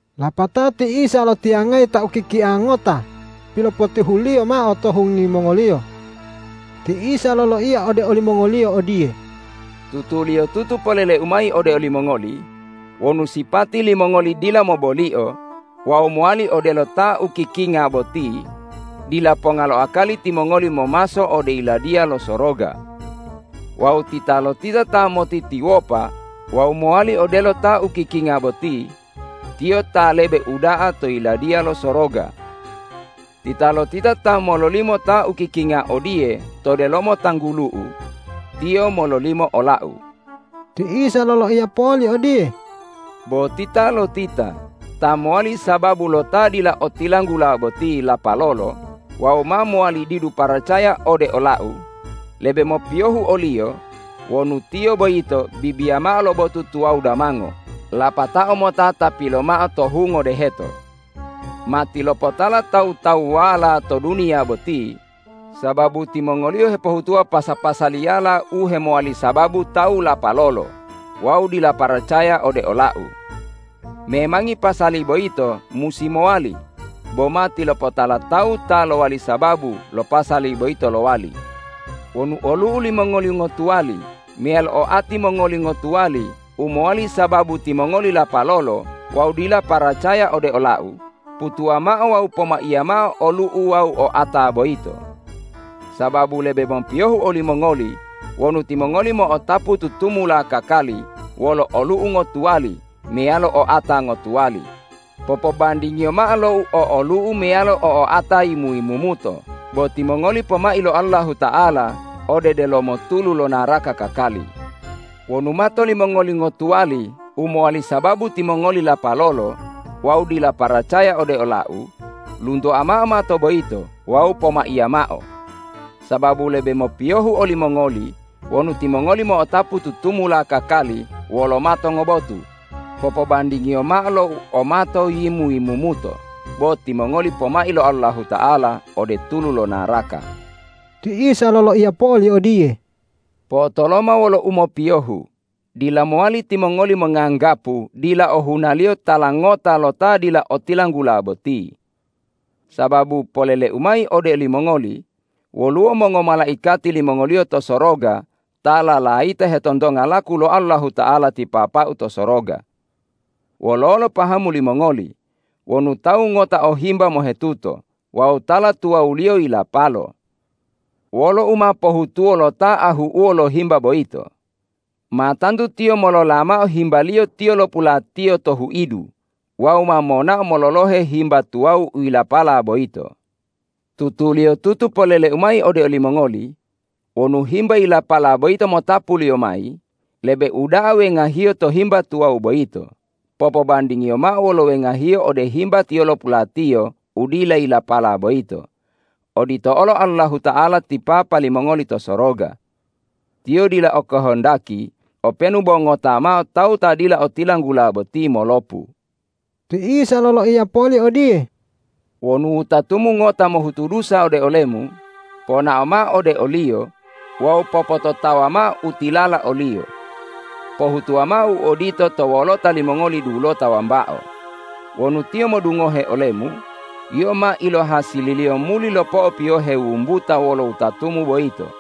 Lapatao ti Isa lotiyangayi ta ukikia ngota pilopotihu-Liyo mao to hungi mongoliyo. Ti Isa loloiya ode olimongoliyo odiye,”Tutuliyotutu polele-U mayi ode olimongoli: Wonu sipati limongoli dila mobolio wawu mowali odelo ta ukikinga boti, dila ponga lo akali timongoli momaso ode Yiladiya lo Soroga. Wawu titalotita ta motitiwopa wawu mowali odelo ta ukikinga boti, tiyo ta lebe uda'a to Yiladiya lo Soroga. Titalotita ta mololimo ta ukikinga odiye to delomo tanggulu-U, tiyo mololimo ola-U.” Ti Isa loloiya poli odiye,”Bo titalotita ta mowali sababu lo ta dila otilanggula boti lapalolo wawu ma mowali didu paracaya ode ola-U, lebe mopiyohu oliyo wonu tiyo boyito bibiya mao lo botu tuwawu damango lapatao mota tapilo mao to hungo deheto. Matilopotala tawu-tawuwala to duniya boti sababu timongoliyo hepohutuwa pasa-pasaliyala u hemowali sababu tawu lapalolo wawu dila paracaya ode ola-U. Memangi pasali boyito musi mowali, bo matilopotala tawu ta lowali sababu lo pasali boyito lowali. Wonu olu'u limongoli ngotuwali meyalo oati mongoli ngotuwali u mowali sababu timongoli lapalolo wawu dila paracaya ode ola-U, putuwa mao wawu pomaiya mao olu'u wawu oata boyito. Sababu lebe mopiyohu olimongoli wonu timongoli mo'otapu tutumula kakali wolo olu'u ngotuwali meyalo oata ngotuwali, popobandingiyo mao lo u o olu'u meyalo o oata yimu-yimumuto bo timongoli pomai lo Allahuta'ala ode delomo tulu lo naraka kakali. Wonu mato limongoli ngotuwali u mowali sababu timongoli lapalolo wawu dila paracaya ode ola-U, luntoa mao mato boyito wawu pomaiya mao. Sababu lebe mopiyohu olimongoli wonu timongoli mo'otapu tutumula kakali wolo mato ngobotu, popobandingiyo mao lo u o mato yimu-yimumuto bo timongoli pomai lo Allahuta'ala ode tulu lo naraka.” Ti Isa loloiya poli odiye,”Po'otoloma wolo umopiyohu, dila mowali timongoli monganggapu dila ohunaliyo tala ngota lo ta dila otilanggula boti. Sababu polele-U mayi ode olimongoli: Woluwo mongomalaikati limongoliyo to soroga ta lalayita hetontonga laku lo Allahuta'ala ti Papa-U to soroga. Wololo pahamu limongoli, wonu tawu ngota o himba mohetuto wawu tala tuwawuliyo yilapalo? Wolo u ma pohutuwo lo ta ahu'uwo lo himba boyito? Ma tantu tiyo molola mao himbaliyo tiyolopulatiyo to huidu wawu ma monao mololohe himba tuwawu u yilapala boyito. Tutuliyotutu polele-U mayi ode olimongoli:Wonu himba yilapala boyito motapuliyo mayi, lebe uda'a wengahiyo to himba tuwawu boyito, popobandingiyo mao wolo wengahiyo ode himba tiyolopulatiyo u dila yilapala boyito. Odito olo Allahuta'ala ti Papa limongoli to soroga. Tiyo dila o kohondaki openu bo ngota mao tawu ta dila otilanggula boti molopu.” Ti Isa loloiya poli odiye,”Wonu wutatumu ngota mohutu dusa ode olemu, ponao mao ode oliyo wawu popototawa mao u tilala oliyo. Pohutuwa mao u odito to wolota limongoli dulota wambao. Wonu tiyo modungohe olemu, yio ma ilohasililiyo muli lopo'opiyohe wumbuta wolo wutatumu boyito.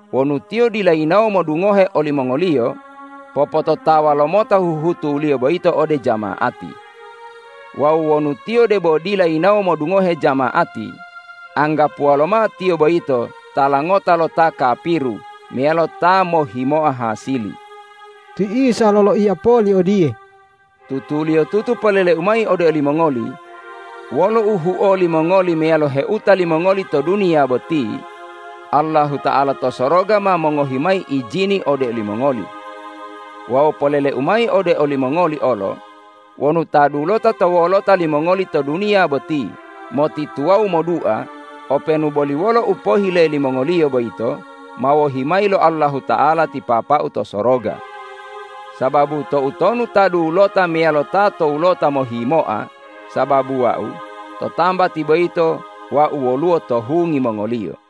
Wonu tiyo dila yinawo modungohe olimongoliyo, popototawa lomota huhutuliyo boyito ode jama'ati. Wawu wonu tiyo debo dila yinawo modungohe jama'ati, anggapuwa lomao tiyo boyito tala ngota lo ta kapiru meyalo ta mohhimoa hasili.” Ti Isa loloiya poli odiye,”Tutuliyotutu polele-U mayi ode olimongoli: Wolo u huo limongoli meyalo heuta limongoli to duniya boti, Allahuta'ala to soroga ma mongohi mayi ijini ode olimongoli. Wawu polele-U mayi ode olimongoli olo: Wonu ta dulota to wolota limongoli to duniya boti motituwawu modua, openu boli wolo u pohile limongoliyo boyito ma wohi mayi lo Allahuta'ala ti Papa-U to soroga. Sababu toutonu ta dulota meyalo ta towulota mohimoa sababu Wau, to tambati boyito Wau woluwo to hungi mongoliyo.”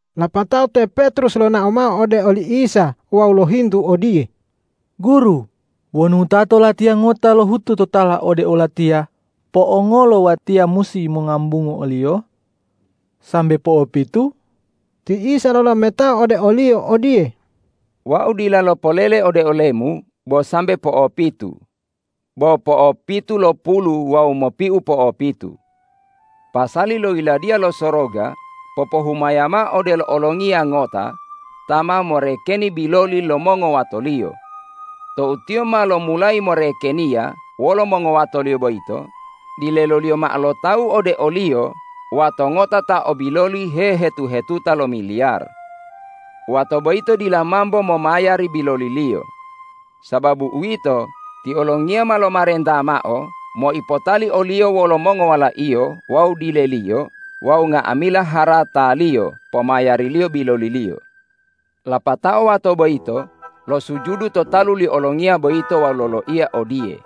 Lapatao te Petrus lonao mao ode oli Isa wawu lohintu odiye,”Guru, wonu wutato latiya ngota lohutu totala ode olatiya, po'ongolo watiya musi mongambungu oliyo? Sambe po'opitu?” Ti Isa lolametao ode oliyo odiye,”Wau dila lopolele ode olemu bo sambe po'opitu, bo po'opitulopulu wawu mopiu po'opitu. Pasali lo Yiladiya lo Soroga popohumaya mao odelo olongiya ngota ta ma morekeni biloli lo mongowatoliyo. Tou tiyo ma lomulayi morekeniya wolo mongowatoliyo boyito, dileloliyo mao lo tawu ode oliyo wato ngota ta o biloli hehetu- hetuta lo miliyar. Wato boyito dila mambo momayari biloliliyo. Sababu uwito, ti olongiya ma lomarenta mao moipotali oliyo wolo mongowalaiyo wawu dileliyo wawu nga'amila harataliyo pomayariliyo biloliliyo. Lapatao wato boyito losujudu to talu li olongiya boyito wawu loloiya odiye,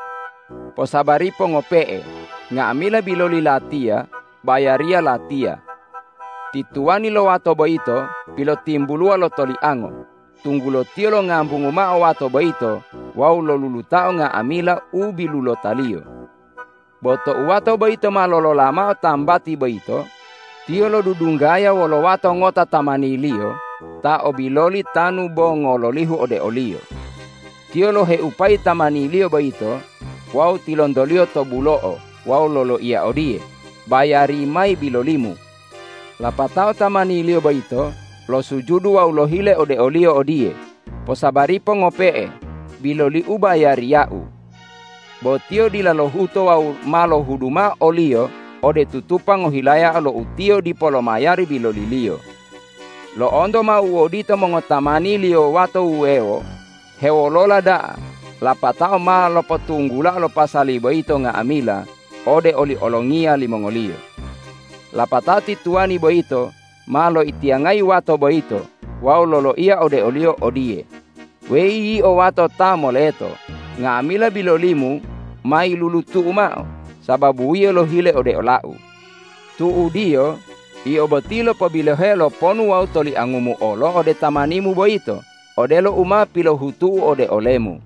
’Posabaripo ngope'e, nga'amila biloli latiya bayariya latiya.’ Ti tuwani lo wato boyito pilotimbuluwa lo toliango, tunggulo tiyo longambungu mao wato boyito wawu lolulutao nga'amila u bilulotaliyo. Bo tou wato boyito ma lolola mao tambati boyito, tiyo lodudunggaya wolo wato ngota tamaniliyo ta o biloli tanu bo ngololihu ode oliyo. Tiyo loheupayi tamaniliyo boyito wawu tilontoliyo to bulo'o wawu loloiya odiye, ’Bayari mayi bilolimu!’ Lapatao tamaniliyo boyito losujudu wawu lohile ode oliyo odiye, ’Posabaripo ngope'e, biloliu bayariyau.’ Bo tiyo dila lohuto wawu ma lohudu mao oliyo ode tutupa ngohilayao lo utiyo dipo lomayari biloliliyo. Lo'onto mao u odito mongotamaniliyo wato wuwewo hewolola da'a lapatao ma lopotunggulao lo pasali boyito nga'amila ode oli olongiya limongoliyo. Lapatao ti tuwani boyito ma loitiyangayi wato boyito wawu loloiya ode oliyo odiye, ’Weyi yio wato ta moleto, nga'amila bilolimu ma yilulutu'u mao sababu yio lohile ode olau. Tu'udiyo yio boti lopobiloheo lo ponu wawu toliangumu olo ode tamanimu boyito odelo u ma pilohutu'u ode olemu.’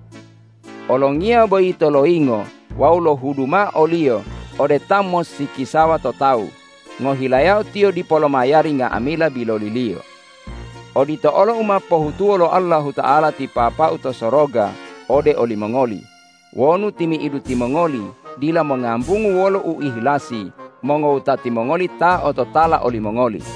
Olongiya boyito loyingo wawu lohudu mao oliyo ode ta mossikisawa to tawu, ngohilayao tiyo dipo lomayari nga'amila biloliliyo. Odito olo u ma pohutuwo lo Allahuta'ala ti Papa-U to soroga ode olimongoli wonu timi'idu timongoli dila mongambungu wolo uihilasi mongowutati mongoli ta ototala olimongoli.”